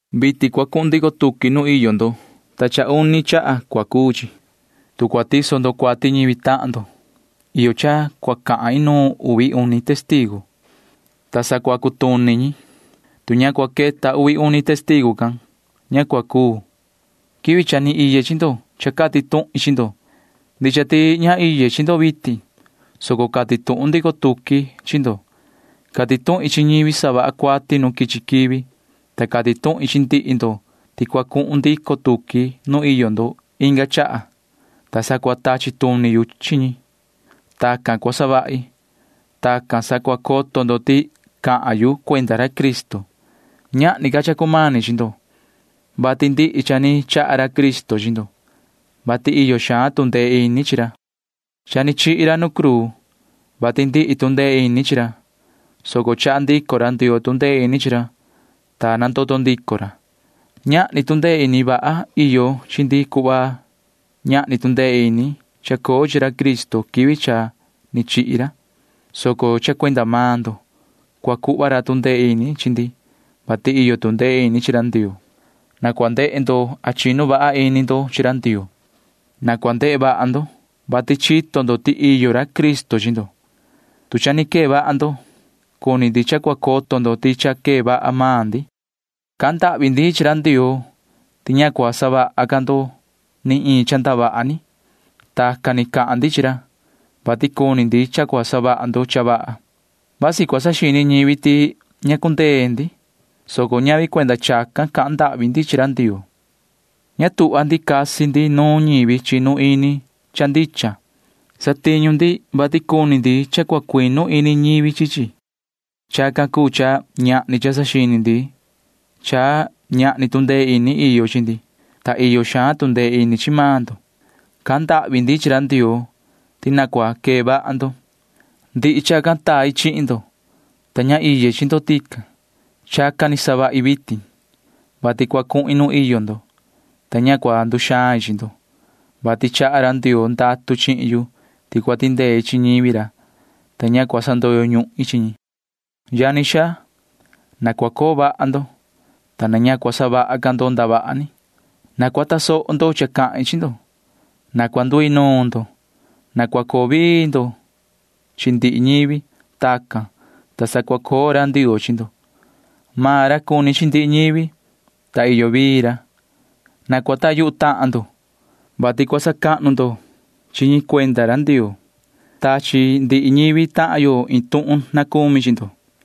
Vitin cua cuhun ndico tuqui nuun iyo ndo, ta uni chaha cua cuu chi. Tu cua tiso ndo cuati ñivi tahan ndo, iyo cha cua cahan inuun uvi uni testigu, [ta sa cua cutuni ñi. Tu ña cua queta uvi uni testigu can, ña cua cuu.] Quivi cha ni iye chi ndo cha cati tuhin chi ndo. Ndicha ti ña iye chi ndo vitin, soco cati tuhun ndico tuqui chi ndo. Cati tuhin chi ñivi savaha cuati nu quichi quivi, ta cati tuhin chi ndihi ndo ti cua cuhun ndico tuqui nu iyo ndo inga chaha, ta sa cua tachi tuni yu chi ñi. Tacan cua savahi. Tacan sa cua coto ndo ti cahan yu cuenda ra Cristo. Ñahni ca cha cumani chi ndo, vati ndihi cha ni chaha ra Cristo chi ndo, vati iyo xaan tu ndee ini chi ra. Cha ni chihi ra nu cruu, vati ndihi tu ndee ini chi ra, soco chaha ndico ra Ndioo tu ndee ini chi ra, ta nandoto ndico ra. Ñahni tu ndee ini vaha iyo chi ndi cuhva ñahni tu ndee ini ni chacoo chi ra Cristo quivi cha ni chihi ra, soco cha cuenda maan ndo cua cuhva ra tu ndee ini chi ndi, vati iyo tu ndee ini chi ra Ndioo. Na cua ndehe ndo a chinu vaha ini ndo chi ra Ndioo. Na cua ndehe vaha ndo, vati chito ndo ti iyo ra Cristo chi ndo, tu cha ni quee vaha ndo. Cuni ndi cha cua coto ndo ti cha quee vaha maan ndi. Cahan ndahvi ndi chi ra Ndioo ti ña cua savaha ca ndo ni iin cha ndavaha ni. Tacan ni cahan ndi chi ra, vati cuni ndi cha cua savaha ndo cha vaha. Vasi cua saxini ñivi ti ña cundee ndi, soco ñavi cuenda chacan cahan ndahvi ndi chi ra Ndioo. Ña tuhva ndi casi ndi nuun ñivi chinu ini cha ndicha. Satiñu ndi, vati cuni ndi cha cua cuinu ini ñivi chi chi. Chacan cuu cha ñahni cha saxini ndi cha ñahni tu ndee ini iyo chi ndi, ta iyo xaan tu ndee ini chi maan ndo. Cahan ndahvi ndi chi ra Ndioo ti na cua quee vaha ndo. Ndihi chacan tai chihin ndo, ta ña iye chi ndo tican. Chacan ni savahi vitin, vati cua cuhin nu iyo ndo, ta ña cua nduxain chi ndo, vati chaha ra Ndioo ndatu chihin yu ti cua tindei chi ñivi ra, ta ña cua sandoyo ñuhin chi ñi. Yani xaa, na cua coo vaha ndo, ta na ña cua savaha ca ndo ndavaha ni. Na cua tasoho ndo cha cahin chi ndo. Na cua nduinuun ndo. Na cua coo vii ndo chi ndihi ñivi. Tacan, ta sa cua coo ra Ndioo chi ndo. Maan ra cuni chi ndihi ñivi, ta iyo vii ra. Na cua coho ndo yuhu tahan ndo, [vati cua sacahnu ndo chi ñi cuenda ra Ndioo]. Tachi ndihi ñivi tahan yo iin tuhun na cumi chi ndo.